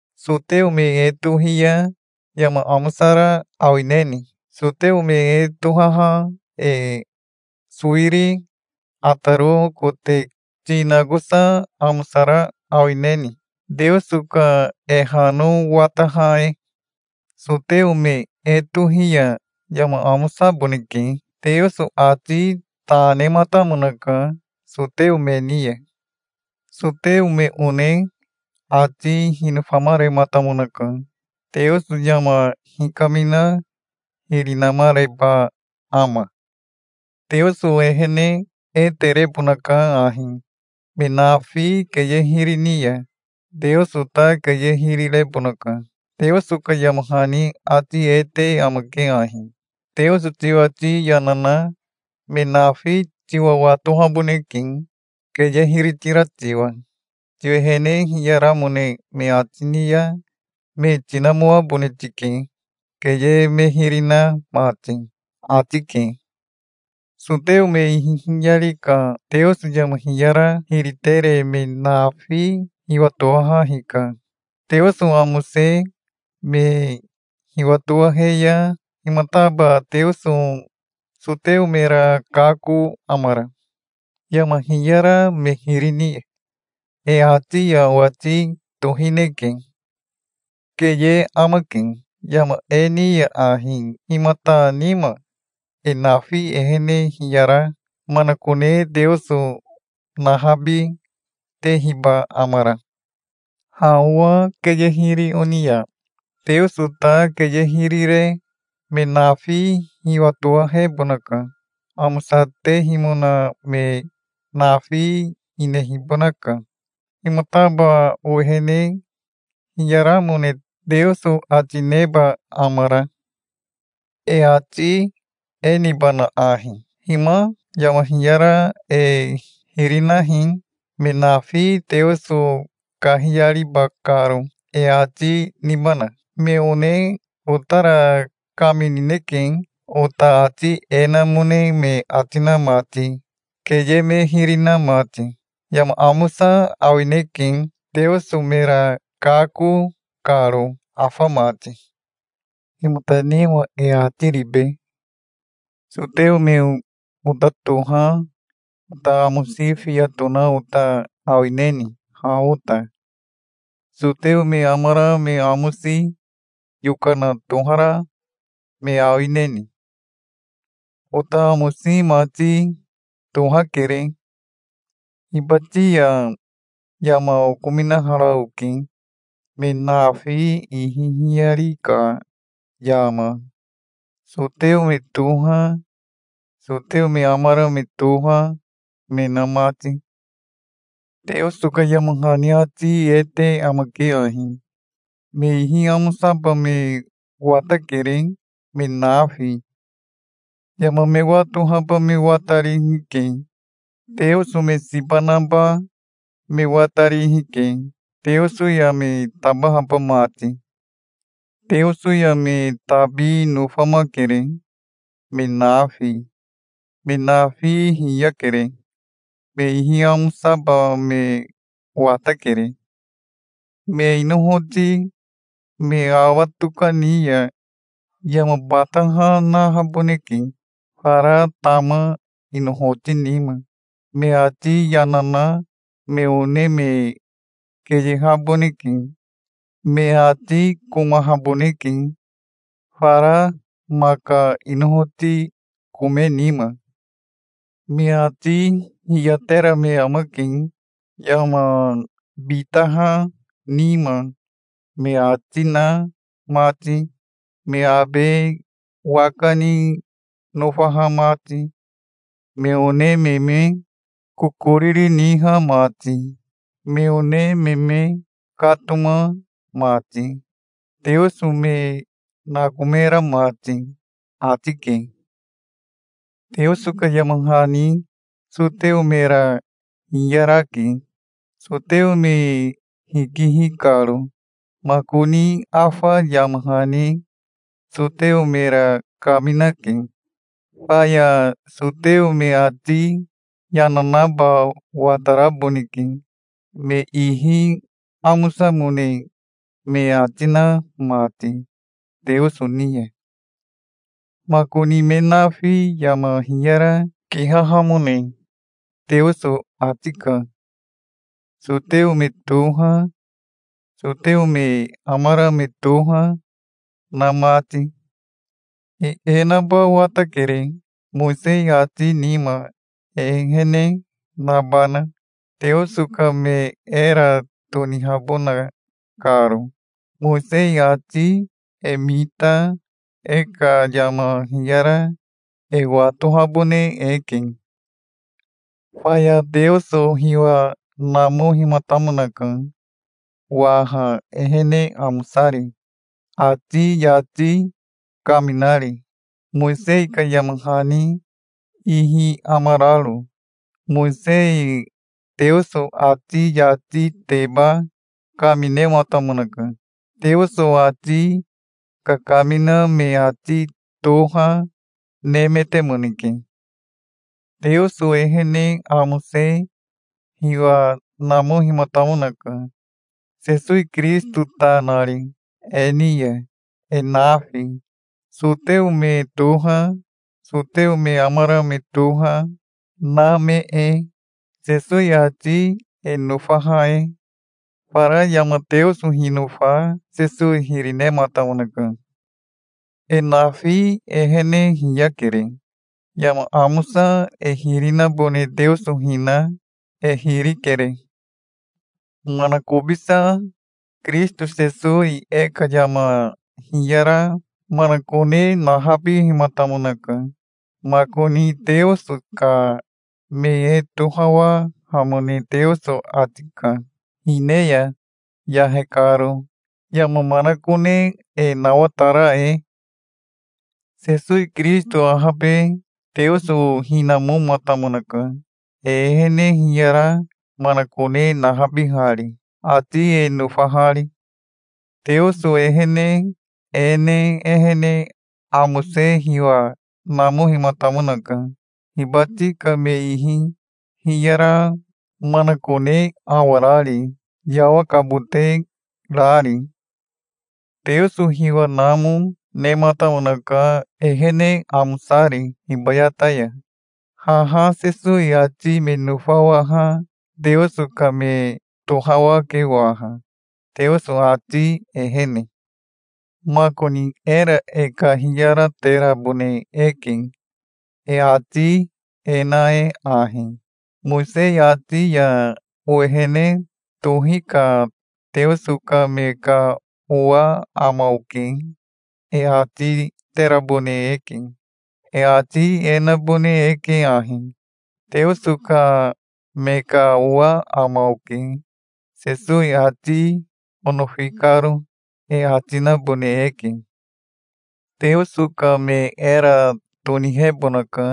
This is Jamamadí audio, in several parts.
Soteo me e tohi ya yama amosara awineni? Soteo me e tohaha e sowiri ataro kote ti nakosa amosara awineni, Teoso ka e hano wataha e? Soteo me e tohi ya yama amosaboneke. Teoso ati ta nematamonaka soteo me ni ya. Soteo me one ati hinofamarematamonaka. Teoso yama hikamina hiri namareba ama? Teoso ehene e terebonaka ahi. Me nafi keye hiri ni ya Teoso ta keye hiri rebonaka. Teoso ka yama hani ati e te amake ahi: "Teoso tiwati yana na me nafi tiwa watohaboneke, keye hiri tira tiwa. Tiwehene hiyaramone me ati ni ya me tinamoabone tike, keye me hiri na mati", ati ke. Soteo me ihi hiyari ka Teoso yama hiyara hiri tere me nafi hiwatowaha hika. Teoso amose me hiwatowahe ya himataba Teoso soteo mera kako amara, yama hiyara me hiri ni ya? E ati ya owati tohineke. Keye amake. Yama e ni ya ahi himata nima e nafi ehene hiyara manakone Teoso nahabi tehiba amara? Ha owa keye hiri oni ya Teoso ta keye hiri re me nafi hiwatowahebonaka. Amosatehimona me nafi hinehibonaka. Himataba owehene hiyaramone Teoso ati neba amara? E ati e nibana ahi: "Hima yama hiyara e hiri nahi, me nafi Teoso kahiyariba karo", e ati nibana? Me one otara kaminineke, ota ati e namone me ati na mati, keye me hiri na mati. Yama amosa awineke, Teoso mera kako karo afa mati. Himata nima e ati ribe? Soteo me ota toha ota amosi fiya tona ota awineni ha ota? Soteo me amara me amosi yokana tohara me awineni? Ota amosi mati tohakere. Hibati ya yama okominahara oke, me nafi ihi hiyari ka yama, soteo me toha, soteo me amara me toha me na mati. Teoso ka yama hani ati e te amake ahi: "Me ihi amosaba me watakere, me nafi. Yama me watohaba me watarihi ke. Teoso me siba naba me watarihi ke, Teoso ya me tabahaba mati. Teoso ya me tabi nofamakere, me nafi. Me nafi hiyakere. Me ihi amosaba me watakere. Me inohoti me awa tokani ya yama bataha nahaboneke fara tama inohoti nima. Me ati yana na me one me keyehaboneke. Me ati komahaboneke, fara maka inohoti kome nima. Me ati hiyatera me amake, yama bitaha nima me ati na mati, me abe waka ni nofaha mati, me one me me kokoriri niha mati, me one me me katoma mati, Teoso me nakomera mati", ati ke. Teoso ka yama hani soteo mera hiyarake, soteo me hikihi karo. Makoni afa yama hani soteo mera kaminake. Faya soteo me ati yana naba wataraboneke, me ihi amosamone me ati na mati Teoso ni ya. Makoni me nafi yama hiyara kihahamone Teoso ati ka, soteo me toha, soteo me amara me toha na mati. E e naba watakere, Mowisei ati nima e ehene nabana, Teoso ka me era tonihabona karo. Mowisei ati e mita e ka yama hiyara e watohabone eke. Faya Teoso hiwa namohimatamonaka waha ehene amosari, ati yati kaminari, Mowisei ka yama hani ihi amararo. Mowisei Teoso ati yatiteba kaminematamonaka. Teoso ati kakamina me ati toha nemetemoneke. Teoso ehene amose hiwa namohimatamonaka, Sesowi Kirisito ta nari, e ni ya, e nafi, soteo me toha, soteo me amara me toha, na me e, Sesowi ati e nofaha e. Fara yama Teoso hinofa Sesowi hiri nematamonaka. E nafi ehene hiyakere. Yama amosa e hiri nabone Teoso hina e hiri kere. Manakobisa Kirisito Sesowi e ka yama hiyara manakone nahabihimatamonaka. Makoni Teoso ka me e tohawahamone Teoso ati ka hine ya, yahe karo, yama manakone e nawatara e. Sesowi Kirisito ahabe Teoso hinamomatamonaka, e ehene hiyara manakone nahabihari, ati e nofahari. Teoso ehene e ne ehene amose hiwa namohimatamonaka, hibati ka me ihi hiyara manakone awarari, yawakabote rari. Teoso hiwa namo, nematamonaka, ehene amosari, hibayata ya. Haha Sesowi ati me nofawaha Teoso ka me tohawake waha, Teoso ati ehene. Makoni era e kahiyaterabone eke, e ati e na e ahi: "Mowisei ati ya owehene tohi ka Teoso ka me ka owa ama oke", e ati terabone eke. E ati e nabone eke ahi: "Teoso ka me ka owa ama oke, Sesowi ati onofi karo", e ati nabone eke. Teoso ka me era tonihebonaka,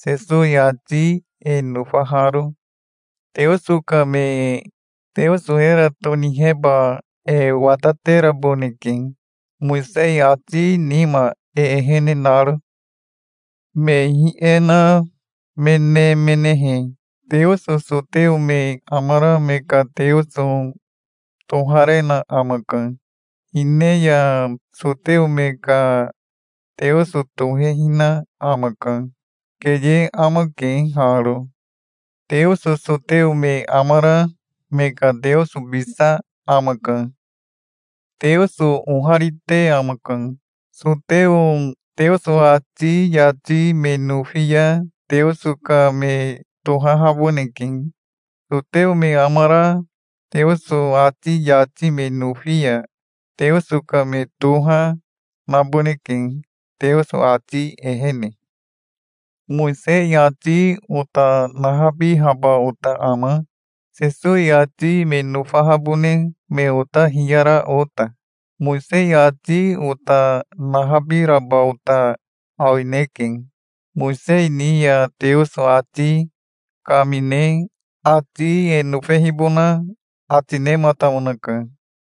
Sesowi ati e nofaharo. Teoso ka me Teoso era toniheba e watateraboneke, Mowisei ati nima e ehene naro. Me ihi e na me nemenehe, Teoso soteo me amara me ka Teoso toharena amaka. Hine ya soteo me ka Teoso tohehina amaka. Keye amake haro. Teoso soteo me amara me ka Teosobisa amaka. Teoso oharite amaka. Soteo Teoso ati yati me nofi ya Teoso ka me tohahaboneke. Soteo me amara Teoso ati yati me nofi ya Teoso ka me toha naboneke Teoso ati ehene. Mowisei ati ota nahabihaba ota ama, Sesowi ati me nofahabone me ota hiyara ota? Mowisei ati ota nahabiraba ota awineke. Mowisei ni ya Teoso ati kamine ati e nofehibona ati nematamonaka.